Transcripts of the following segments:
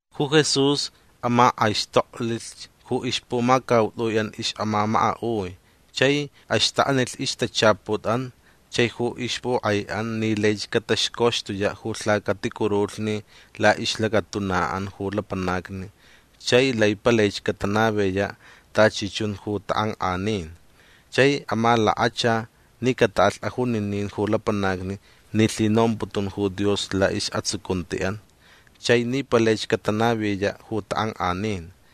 Ju Jesús amak'aixtoklich ju ixpumacaut'ui'an ix'amamaka'ui chai axtaknilh ixtachaput'an chai ju ixpuk'ai'an ni laich cataxcoxtuya' ju lhacaticurulhni la'ixlacatuna'an ju lapanacni chai lai palaich catanaviya' tachi chun ju tak'ank'anin. Chai amalakacha ni cata'alh ajuninin ju lapanacni ni lhinomputun ju Dios la'is'atsucunti'an chai ni palaich catanaviya' ju tak'ank'anin.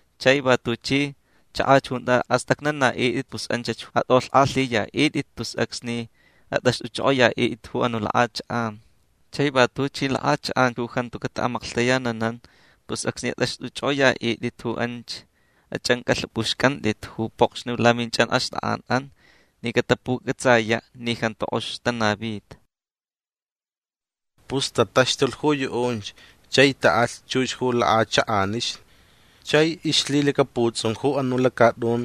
Chai va tuchi chakach junta ast'acnana'it'it pus anch ju at'olhk'alhiya'it'it tus acsni at'axt'uch'ok'oya'it'it ju anu' lak'achak'an. Chai va tuchi lak'achak'an ju jantu cata'amaklhtayananan pus acsni at'axt'uch'ok'oya'it'it ju anch ach'anc'alhap'uxc'ant'it ju pokxni laminch'anxt'ak'an'an ni catapuc'atsaya' ni jantu k'ox tanavita. Pus tataxtulh ju yu'unch chai ta'alh chux ju lak'achak'anixni. Chai ixlhilacaputs'un ju anu' lacat'un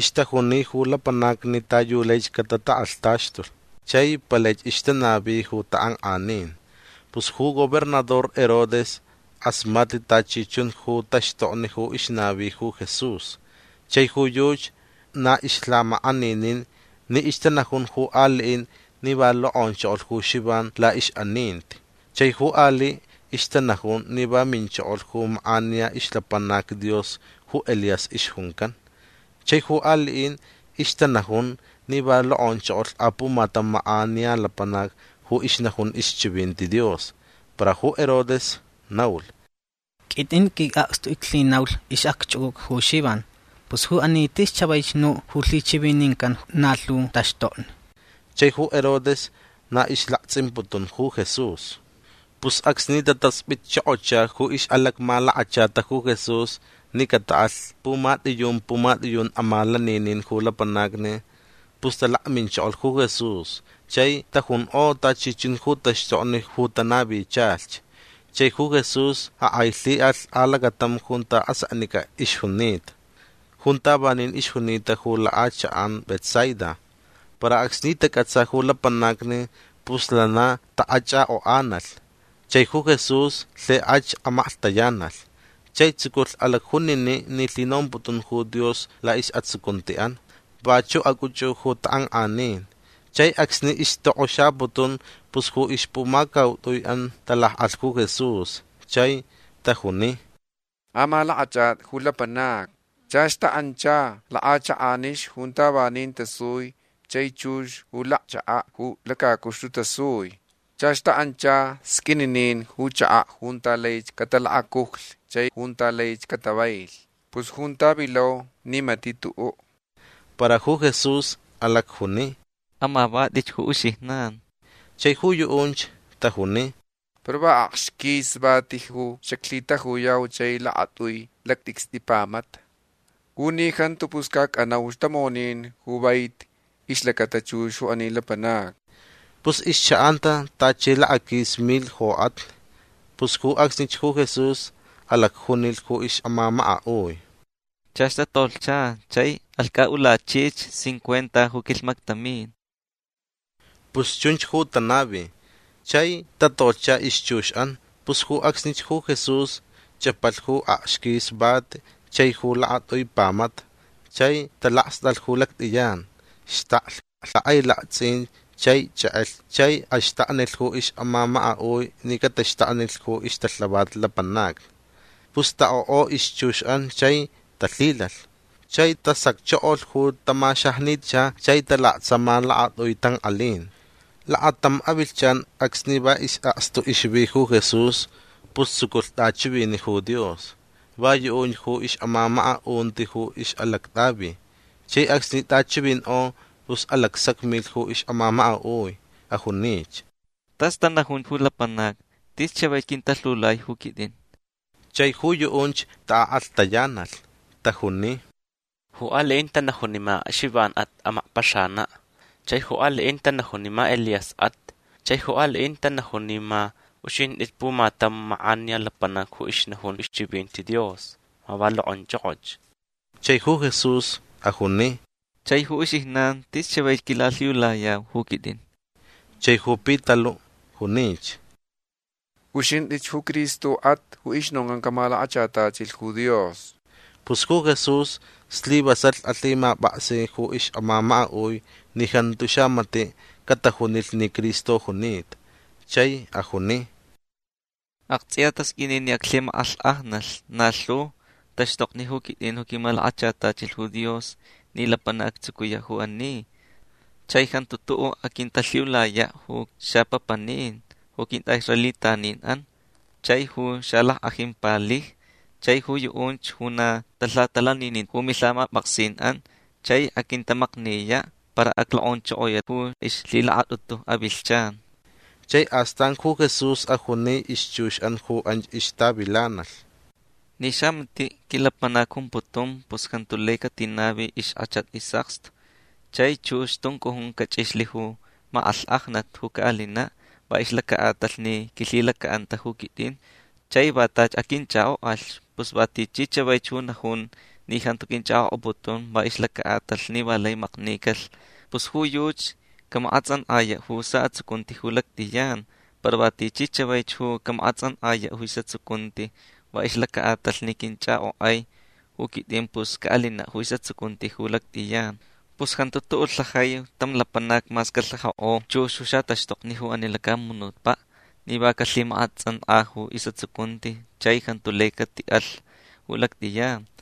ixtajuni ju lapanacni ta yu laich catatak'alhtaxtulh. Chai palaich ixtanavi ju tak'ank'anin. Pus ju gobernador Herodes k'asmatlh tachi chun ju taxtokni ju ixnavi ju Jesús. Chai ju yuchi na ixlhamak'aninin ni ixtanajun ju ali'in ni va lok'onchokolh ju Xivan la'ix'aninti. Chai ju ali' ixtanajun ni va minchokolh ju mak'aniya ixlapanac Dios ju Elías ixjuncan. Chai ju ali'in ixtanajun ni va lok'onchokolh apumatam mak'aniya lapanac ju ixnajun ixchivinti Dios. Para ju Herodes naulh: ―Quit'in qui'akstu iclhinaulh ix'acch'uc'uca ju Xivan. Pus ju ani tis chavaich nu' ju lhichivinincan na lhu taxtokni. Chai ju Herodes na ixlakts'imputun ju Jesús. Pus acsni tatasp'itchokocha ju ix'alacmalakachata ju Jesús ni cata'alh pumat'iyun pumat'iyun amalaninin ju lapanacni pus talakminchokolh ju Jesús chai tajunk'o tachi chun ju taxtokni ju tanavichalhch. Chai ju Jesús ak'ailhi'alh alacatam junta aseknic'a ixjunita. Junta vanin ixjunita ju lak'achak'an Betsaida. Para acsni tac'atsa ju lapanacni pus lana ta'ach'ak'ok'analh. Chai ju Jesús lhik'ach amaklhtayanalh. Chai tsuculh alacjunini' ni lhinomputun ju Dios la'is'atsucunti'an. Vachu' ac'uch'u ju tak'ank'anin. Chai acsni ixtok'oxaputun pus ju ixpumacaut'ui'an talak'alh ju Jesús chai tajuni: ―Amalak'ach'at'i ju lapanacni. Chach ta'ancha lak'achak'anixni junta vanin tasui chai chux ju lacchaka' ju lacacuxtu tasui. Chach ta'ancha sq'uininin ju chaka' junta laich catalakacujlh chai junta laich catavailh. Pus junta vilau ni mati' tu'u'. Para ju Jesús alacjuni: ―Amavat'itch ju uxijnan. Chai ju yu'unch tajuni: ―Para va akxquisich vati ju xaclhitajuyau chai lakat'ui lact'icst'i pamata. U ni jantu pus ca ac'anauch tamonin ju vaiti ixlacata chux ju ani lapanacni. Pus ixcha'anta tachi lakaquis milh jok'atni. Pus ju acsnich ju Jesús alacjunilh ju ix'amamaka'ui: ―Chach tatolhcha chai alhc'a'ulachich cincuenta ju quilhmaktamin. Pus chunch ju tanavi. Chai tatolhcha ixchux'an. Pus ju acsnich ju Jesús ch'apalh ju akxquis vati chai ju lakat'ui pamata chai talakst'alh ju lact'iyan. Xtaklh lhak'ailakts'in chai ch'ek'elh chai axtaknilh ju ix'amamaka'ui ni cataxtaknilh ju ixtalhavat lapanacni. Pus ta'ok'o ixchux'an chai talhilalh. Chai tasacchokolh ju tamaxajnicha chai talaktsama lakacaut'ui tank'alin. Lakatam avilhchan acsni va is'akstu ixvi ju Jesús pus tsuculh t'achivini' ju Dios. Va yu'unch ju ix'amamaka'unti ju ix'alact'avi. Chai acsni t'achivink'o pus alacsacmilh ju ix'amamaka'ui. Ajunich: ―Tas tanajun ju lapanacni. Tis chavaich quintalhiulai ju quit'in. Chai ju yu'unch tak'alhtayanalh. Tajuni: ―Ju ali'in tanajun ni ma Xivan'at ju amakpaxana'. Chai ju ali'in tanajun ni ma Elías'at. Chai ju ali'in tanajun ni ma uxint'ich pumatam mak'aniya lapanac ju ixnajun ixchivinti Dios. Ma va lok'onch'ok'och. Chai ju Jesús ajuni: ―Chai ju uxijnan tis chavaich quilalhiulayau ju quit'in. Chai ju Pitalu' junich: ―Uxint'ich ju Cristo'at ju ixnoncan camalakachatachilh ju Dios. Pus ju Jesús slivasalh alhimap'aksi ju ix'amamaka'ui ni jantu xamati' catajunilh ni Cristo junita. Chai ajuni: ―Akts'iya tasq'uini ni aclhimak'alhk'ajnalh na lhu taxtokni ju quit'in ju quimalakachatachilh ju Dios ni lapanac actsucuya' ju ani. Chai jantu tu'u' aquintalhiulaya' ju xapapanin ju quint'a'israelitanin'an chai ju xalack'ajin palijni chai ju yu'unch ju na talhatalanininta ju milhamap'aksin'an. Chai aquintamakniya'. Para aclok'onchokoya' ju ixlhilakat'utu avilhchan. Chai astan ju Jesús ajuni ixchux'an ju anch ixtavilanalh: ―Ni xamati' quilapanac jumputun pus jantu lai catinavi ixk'achat is'akstu. Chai chux tuncujun cach'ixlh ju mak'alhk'ajnat ju ca'alina' va ixlaca'atalh ni quilhilaca'anta ju quit'in. Chai va tachi aquinch'ak'ok'alh. Pus va tichi chavaich ju najun ni jantu quinch'ak'ok'aputun va ixlaca'atalh ni va lai maknicalh pus ju yuchi camak'ats'ank'aya' ju sa'atsucunti ju lact'iyan. Para va tichi chavaich ju camak'ats'ank'aya' ju is'atsucunti va ixlaca'atalh ni quinch'ak'ok'ai ju quit'in pus ca'alina' ju is'atsucunti ju lact'iyan. Pus jantu tu'u' lhajai tam lapanac mas calhajak'o chux ju xataxtokni ju ani lacamunutpa' ni va calhimak'ats'ank'a ju is'atsucunti chai jantu lai cati'alh ju lact'iyan.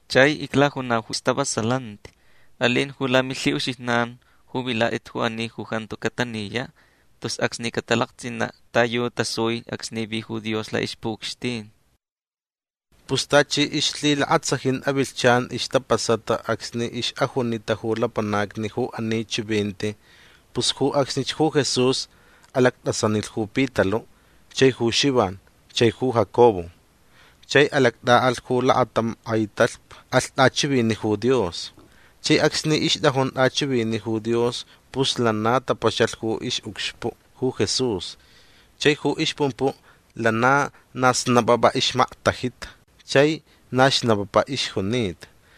Chai iclajunau ju stavasalanti. Alin ju lamilhi'uxijnan ju vilat'it ju ani ju jantu cataniya' tus acsni catalakts'ina' ta yu tasui acsni vi ju Dios la'ixpu'ucxtin. Pus tachi ixlhilakatsajin avilhchan ixtapasata acsni ix'ajunita ju lapanacni ju ani chivinti. Pus ju acsnich ju Jesús alact'asanilh ju Pitalu' chai ju Xivan chai ju Jacobo. Chai alact'a'alh' ju lakatam k'ai talhpa. Alh t'achivini' ju Dios. Chai acsni ixt'ajun t'achivini' ju Dios pus lana tapaxalh ju ix'ucxpu' ju Jesús. Chai ju ixpumpu' lana na xlap'ap'a ixmaktajita chai na xnapapa ixjunita.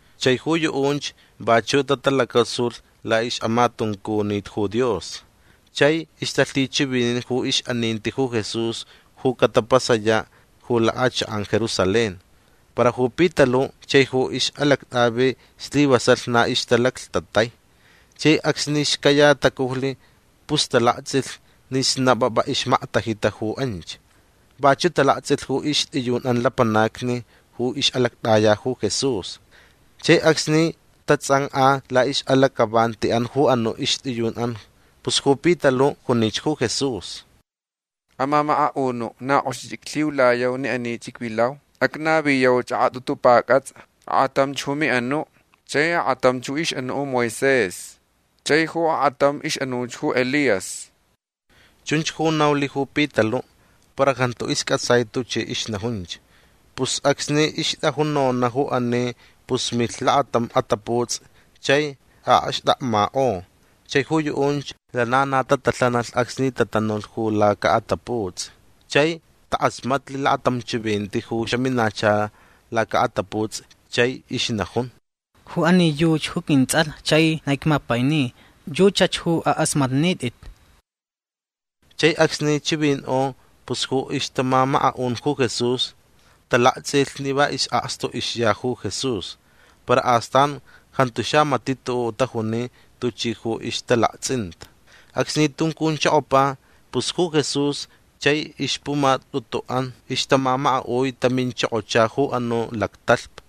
Chai ju yu'unch vachu' tatalacasulh la'ix'amatuncunit ju Dios. Chai ixtalhichivinin ju ix'aninti ju Jesús ju catapasaya' ju lak'achak'an Jerusalén. Para ju Pitalu' chai ju ix'alact'avi slivasalh na ixtalaclhtatai. Chai acsni xcaya tacujlh pus talakts'ilh ni xlap'ap'a ixmaktajita ju anch. Vachu' talakts'ilh ju ixt'iyun'an lapanacni ju ix'alact'aya ju Jesús. Chai acsni tats'ank'a la'ix'alac'avanti'an ju anu' ixt'iyun'an pus ju Pitalu' junich ju Jesús: ―Amamaka'unu' na k'oxich iclhiulayau ni anich icvilau. Acnaviyauch ak'at'utu pac'ats'a. Ak'atamch ju mi'anu'. Chai ak'atamch ju ix'anu' ju Moisés. Chai ju ak'atamch ix'anu' ju Elías. Chunch ju naulh ju Pitalu' para jantu isc'atsai tuchi ixnajunch. Pus acsni ixt'ajun nona' ju ani pus milh lakatam ataputs'i chai a'akxtakmak'o. Chai ju yu'unch lana na tatalhanalh acsni tatanulh ju laca'ataputs'i. Chai tak'asmatlh lakatam chivinti ju xaminacha laca'ataputs'i chai ixnajun: ―Ju ani yuchi ju quints'alh chai na icmapaini. Yuchach ju ak'asmatnit'it. Chai acsni chivink'o pus ju ixtamamaka'un ju Jesús talakts'ilh ni va is'akstu ixya ju Jesús. Para astan jantu xamati' tu'u' tajuni tuchi ju ixtalakts'inta. Acsni tuncunchokopa pus ju Jesús chai ixpumat'utu'an ixtamamaka'ui taminchokocha ju anu' lactalhpa.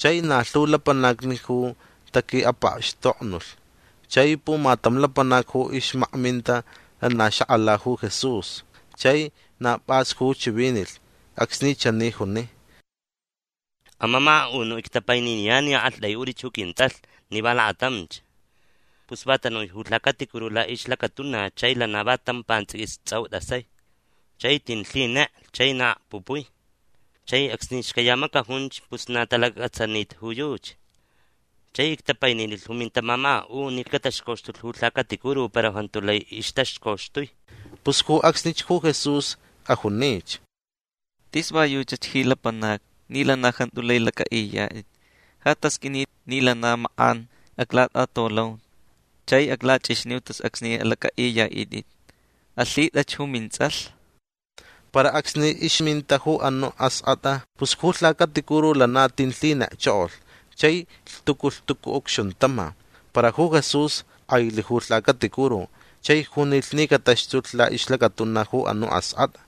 Chai na lhu lapanacni ju taqui'apakxtoknulh. Chai pumatam lapanac ju ixmakminta lana xak'ala ju Jesús. Chai na p'as ju chivinilh acsni chani juni: ―Amamaka'unu' ictapaininiyan ni a'akt'ai'ut'ich ju quints'alh ni va lakatamch. Pus va tanui ju lhacaticuru la'ixlacatuna chai lana va tam pants'iquis ts'au t'asai. Chai tin lhinek chai na akpupui. Chai acsni xcaya macajunch pus na talacac'atsanita ju yuchi. Chai ictapaininilh ju mintamamaka'un ni cataxcoxtulh ju lhacaticuru para jantu lai ixtaxcoxtui. Pus ju acsnich ju Jesús ajunich: ―Tis va yuchach ji lapanacni ni lana jantu lai lac'a'iyat'it. Ja tasq'uini ni lana na mak'an aclat'atolau chai aclach'ixniu tus acsni alac'a'iya'it'it. Alhit'ach ju mints'alh. Para acsni ixminta ju anu' ask'at'a pus ju lhacaticuru lana tin lhinekchokolh chai lhtucu lhtucu ucxuntama. Para ju Jesús k'ailh ju lhacaticuru chai junilh ni cataxtulh la'ixlacatuna ju anu' ask'at'a.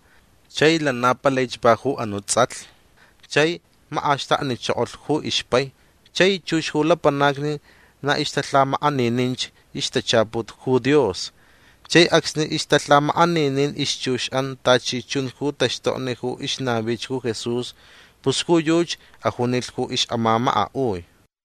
Chai lana palaich va ju anu' ts'alh. Chai mak'axtaknichokolh ju ixpai. Chai chux ju lapanacni na ixtalhamak'anininch ixtachaput ju Dios. Chai acsni ixtalhamak'aninin ixchux'an tachi chun ju taxtokni ju ixnavich ju Jesús pus ju yuchi ajunilh ju ix'amamaka'ui: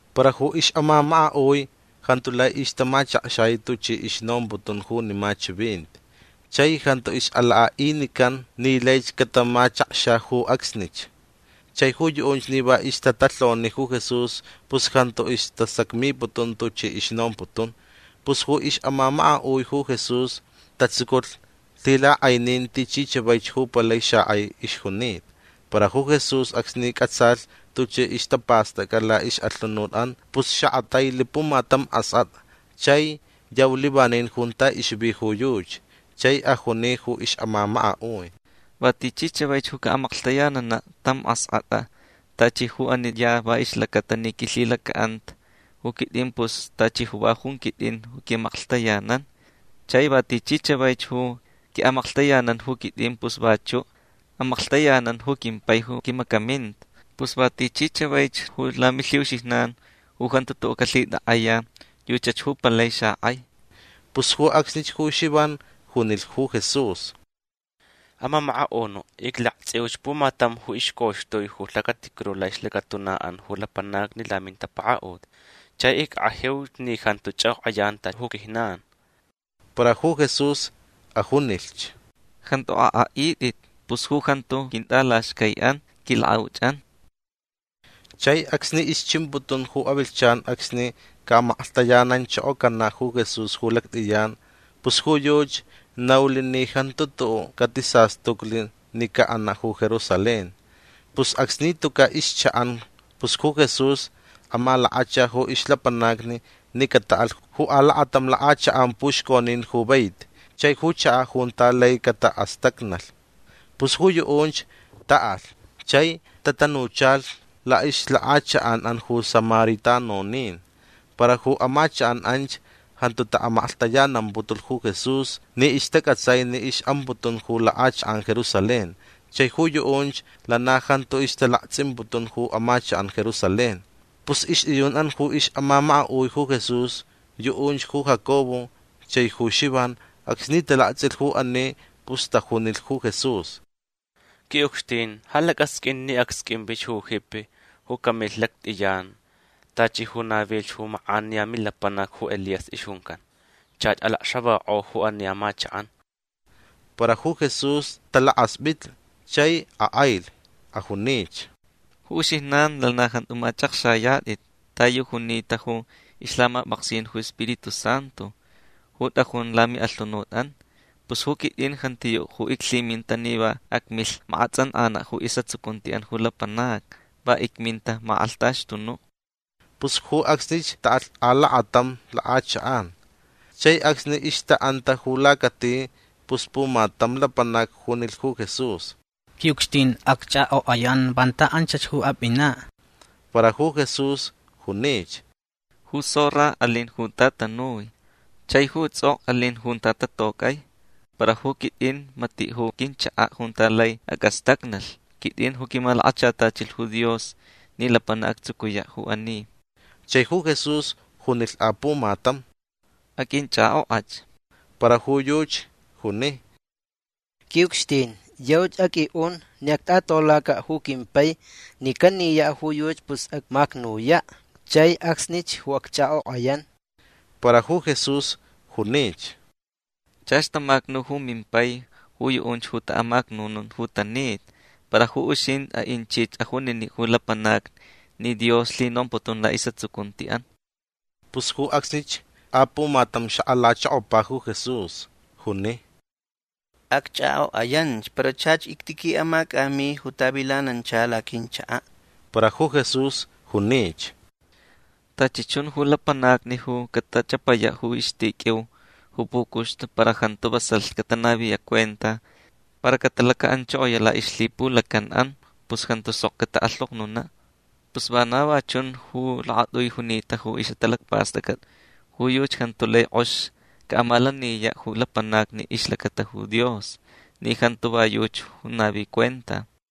Para ju ix'amamaka'ui jantu lai ixtamachakxai tuchi ixnomputun junima chivinti chai jantu ix'alak'a'inican ni laich catamachakxa ju acsnich. Chai ju yu'unch ni va ixtatalhoni ju Jesús pus jantu istasacmiputun tuchi ixnomputun. Pus ju ix'amamaka'ui ju Jesús tatsuculh lhilak'ainin tichi chavaich ju palai xak'ai ixjunita. Para ju Jesús acsni c'atsalh tuchi ixtapast'ac'a la'ix'alhunut'an pus xak'atailh pumatam ask'at'a chai yaulh vanin junta ixvi ju yuchi. Chai ajuni ju ix'amamaka'ui: ―Va tichi chavaich ju ca'amaklhtayanana' tam ask'at'a tachi ju ani ya va ixlacata ni quilhilaca'anta ju quit'in pus tachi ju va jun quit'in ju qui'amaklhtayanan. Chai va tichi chavaich ju qui'amaklhtayanan ju quit'in pus vachu' amaklhtayanan ju quimpai ju quimacaminta. Pus va tichi chavaich ju lamilhi'uxijnan ju jantu tu'u' calhitak'aya yuchach ju palai xak'ai. Pus ju acsnich ju Xivan junilh ju Jesús: ―Amamaka'unu' iclakts'iu pumatam ju ixcoxtui ju lhacaticuru la'ixlacatuna'an ju lapanacni lamintapaka'ut. Chai ick'ajiuch ni jantu ch'ak'ok'ayan tachi ju quijnan. Para ju Jesús ajunilhch: ―Jantu ak'a'it'it. Pus ju jantu quint'alaxcai'an quilak'auch'an. Chai acsni ixchimputun ju avilhchan acsni ca'amaklhtayananchokocana' ju Jesús ju lact'iyan pus ju yuchi naulh ni jantu tu'u' catisastuclh ni ca'ana' ju Jerusalén. Pus acsni tuca' ixcha'an pus ju Jesús amalakacha ju ixlapanacni ni cata'alh ju alakatam lak'achak'an puxconin ju vaiti chai ju chaka' junta lai cata'astacnalh. Pus ju yu'unch ta'alh chai tatanuchalh la'ixlak'achak'an'an ju samaritanonin. Para ju amachak'an anch jantu ta'amaklhtayanamputulh ju Jesús ni ixtac'atsai ni ix'amputun ju lak'achak'an Jerusalén chai ju yu'unch lana jantu ixtalakts'imputun ju amachak'an Jerusalén. Pus ixt'iyun'an ju ix'amamaka'ui ju Jesús yu'unch ju Jacobo chai ju Xivan acsni talakts'ilh ju ani pus tajunilh ju Jesús: ―Qui'ucxtin ja lac'asq'uin ni acsq'uinvich ju jipi ju camilh lact'iyan tachi ju navilh ju mak'aniya milapanac ju Elías ixjuncan. Chach lacxavak'o ju ani amachak'an. Para ju Jesús talakasp'itlh chai ak'ailh. Ajunich: ―Ju uxijnan lana jantu mach'akxayat'it ta yu junita ju ixlhamap'aksin ju Spiritu Santu ju t'ajun lami'alhunut'an. Pus ju quit'in jantiyu' ju iclhiminta ni va acmilh mak'ats'ank'ana' ju is'atsucunti'an ju lapanacni. Va icminta amak'alhtaxtunu'. Pus ju acsnich ta'alh alakatam lak'achak'an. Chai acsni ixta'anta ju lacati pus pumatam lapanac junilh ju Jesús: ―Qui'ucxtin acch'ak'ok'ayan vanta anchach ju ap'ina'. Para ju Jesús junich: ―Ju zorra alin junta tanui. Chai ju ts'ok'o alin junta tatoc'ai. Para ju quit'in mati' ju quinchaka' junta lai ac'astacnalh. Quit'in ju quimalakachatachilh ju Dios ni lapanac actsucuya' ju ani. Chai ju Jesús junilh apumatam: ―Aq'uinch'ak'ok'ach. Para ju yuchi juni: ―Qui'ucxtin yauch aq'ui'un ni act'at'olaca' ju quimpai. Ni caniya' ju yuchi pus acmacnuya' chai acsnich ju acch'ak'ok'ayan. Para ju Jesús junich: ―Chach tamacnu ju mimpai ju yu'unch ju ta'amacnunun ju tanita. Para ju uxint'i a'inchich ajunini' ju lapanacni ni Dios lhinomputun la'is'atsucunti'an. Pus ju acsnich apumatam xak'alachokopa ju Jesús. Juni: ―Acch'ak'ok'ayan para chach ictiqui'amac'ami ju tavilanancha laquinchaka'. Para ju Jesús junich: ―Tachi chun ju lapanacni ju catach'apaya' ju ixtiq'uiu ju pucuxtu para jantu vasalh catanaviya' cuenta para catalaca'anchokoya' la'ixlhipulacan'an pus jantu sok catalhoknuna'. Pus vana va chun ju lakat'ui junita ju ix'atalacpast'ac'at. Ju yuchi jantu lai k'ox ca'amalaniya' ju lapanacni ixlacata ju Dios ni jantu va yuchi ju navi cuenta.